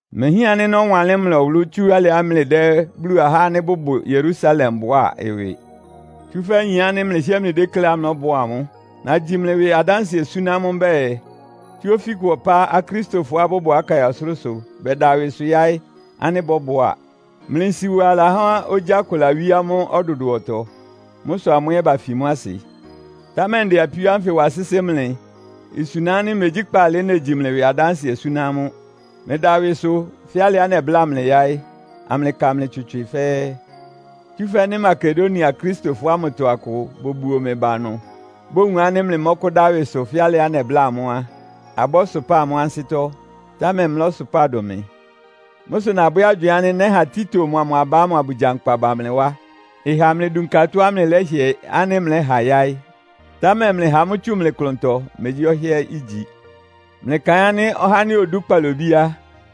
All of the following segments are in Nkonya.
Imehián ánɩ́ nɔ́wanlɩ́n mlɩ ɔwʋlʋ́ tsú alɩá mlɩdɛ́ Bulu ahá ánɩ́ bʋbʋ Yerusalem bʋá ɩwɩ. Tsúfɛ́ nyin ánɩ́ mlɩhɩ́ɛ́ mlɩdékléá mlɔ́bʋá amʋ́. Nagyi mlɩ ɩwɩ adánsɩɛ súná amʋ́ mbɛ́ɛ, tsú ofíkʋ ɔpá Akristofɔá bʋbʋ Akaia ɔsʋlʋ́sʋ bɛda ɩwɩsʋ yáɩ́ ánɩ́ bɔ́bʋá. Mlɩ nsiwa lahá ogyá kʋ lawíé amʋ́ ɔdʋdʋɔtɔ. Mʋ́ sʋ amʋ́ ɛ́ bafi mʋ́ asɩ. Támɛ ndɛ apíó ánfɩ wa sɩ́sɩ́ mlɩ, isuna ánɩ́ megyí kpaalɩ negyi mlɩ ɩwɩ adánsɩɛ súná amʋ́. Mlɩda ɩwɩsʋ, fɛ́ alɩá nɛbláa mlɩ yáɩ́, amlɩka mlɩ tswɩtswɩ fɛ́ɛ́. Tsúfɛ́ nɩ́ Makedonia Akristofɔ ámʋtɔ akʋ bobuo mɩ ba ɩnʋ, bowun ánɩ́ mlɩmɔ́kʋ́dá ɩwɩsʋ fɛ́ alɩá nɛbláa amʋ́ á, abɔ́sʋpáa amʋ́ ansɩ́tɔ́, támɛ mlɔ́sʋpáa dʋn mɩ. Mʋ́ sʋ nabwɛ́ agywɩɩn ánɩ́ nɛ́ha Tito mʋa mʋ aba ámʋ abʋgyankpa ba mlɩ wá, ɩha amlɩdunka tɔ́á mlɩlɛ́hɩɛ ánɩ́ mlɛ́ha yáɩ́. Támɛ mlɩha mʋ́ tsú mlɩ klʋntɔ, megyí ɔhɩ́ɛ́ igyi. Mlɩkaɩn ánɩ́ ɔhá ánɩ́ odú kpalobí á,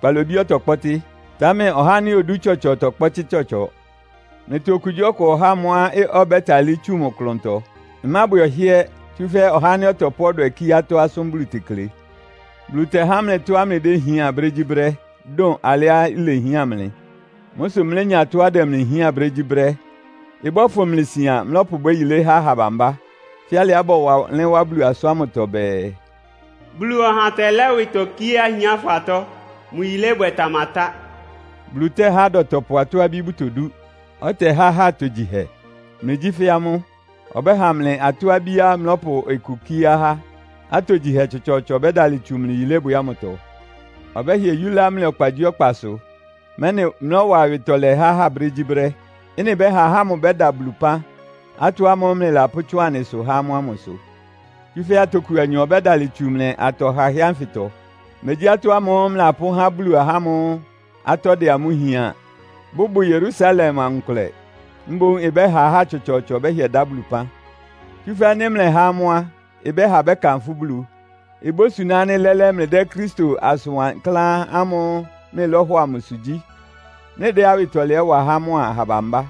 kpalobí ɔtɔkpɔ́tɩ́, támɛ ɔhá ánɩ́ odú tsɔtsɔ tɔkpɔ́tɩ́ tsɔtsɔ. Mlɩtɔ okugyíɔkʋ ɔháa mʋ́á ɔbɛ́talɩ́ tsu mʋ klʋntɔ. Ɩmábwɛ ɔhɩ́ɛ́, tsúfɛ́ ɔhá ánɩ́ ɔtɔpʋ́ ɔdwɛ kíé atɔ́ asʋ́n Bulu tekle. Bulu tɛhá mlɩ tɔ́á mlɩdéhián brégyíbrɛ́, dʋn alɩá ilehián mlɩ. Mʋ́ sʋ mlénya tɔ́á ɩdɛ mlɩ hián brégyíbrɛ́. Ɩbɔ́fʋn mlɩ sian, mlɔ́pʋbwɛ́ yilé há aha bambá. Fɛ́ alɩá bɔwanlɩ́n wá Bulu asʋ́n ámʋtɔ bɛɛ, “Bulu ɔha tɛlɛ́ ɩwɩtɔ kíé ahiánfɔ atɔ́. Mʋ yilébwɛ tamatá.” Bulu tɛ́há adɔtɔpʋ atɔ́-abí bʋtodú, ɔtɛhá ahá atogyihɛ. Mlɩgyí fɛ́ amʋ́. Ɔbɛ́ha mlɩ atɔ́-abíá mlɔ́pʋ ɩkʋ kíé ahá, atogyihɛ tsɔtsɔɔtsɔ bɛ́dalɩ tsu mlɩ yilébwɛ ámʋtɔ. Ɔbɛ́hɩɛ yúlá mlɩ ɔkpagyíɔkpasʋ, mɛ́nɩ mlɔ́wa awɩtɔlɛ há ahá brégyíbrɛ́. Ɩ́nɩ ɩbɛ́ha ahá ámʋ bɛ́da Bulu ɩpán, atɔ́ ámʋ́ʋ́ mlɩlapʋ́tsʋn anɩsʋ há amʋ́ ámʋ sʋ. Tsúfɛ́ atoku anyɔ ɔbɛ́dalɩ tsu mlɩ atɔ hahɛ́ ánfɩtɔ. Megyí atɔ́ ámʋ́ʋ́ mlɩlapʋ́há Bulu ahá ámʋ́ʋ́ atɔ́ dɛ amʋ́ hián, bʋbʋ Yerusalem amʋ nkʋlɛ, mboún ɩbɛ́ha ahá tsɔtsɔɔtsɔ bɛ́hɩɛ dá Bulu ɩpán. Tsúfɛ́ nɩ́ mlɛhá amʋ́ á, ɩbɛ́ha bɛ́kanfʋ́ Bulu. Ibósuná ánɩ́ lɛ́lɛ́ mlɩdɛ́ Kristo asʋn wankláán ámʋ́ʋ́ mlɩlɔ́hɔ amʋsʋ gyí, mlɩdɛ́ awɩtɔlɛ ɛ́ wa há amʋ́a aha bambá.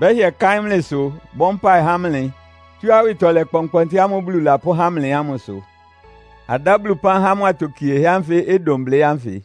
Bɛ́hɩɛ káɩ́n mlɩsʋ, bɔ́ mpáɩ há mlɩ, tsú awɩtɔlɛ kpɔnkpɔntɩ ámʋ́ʋ́ Bulu lapʋ́há mlɩ ámʋ sʋ. Adá Bulu ɩpán há mʋ atokiehɛ́ ánfɩ ɩdʋn blɩ́ ánfɩ!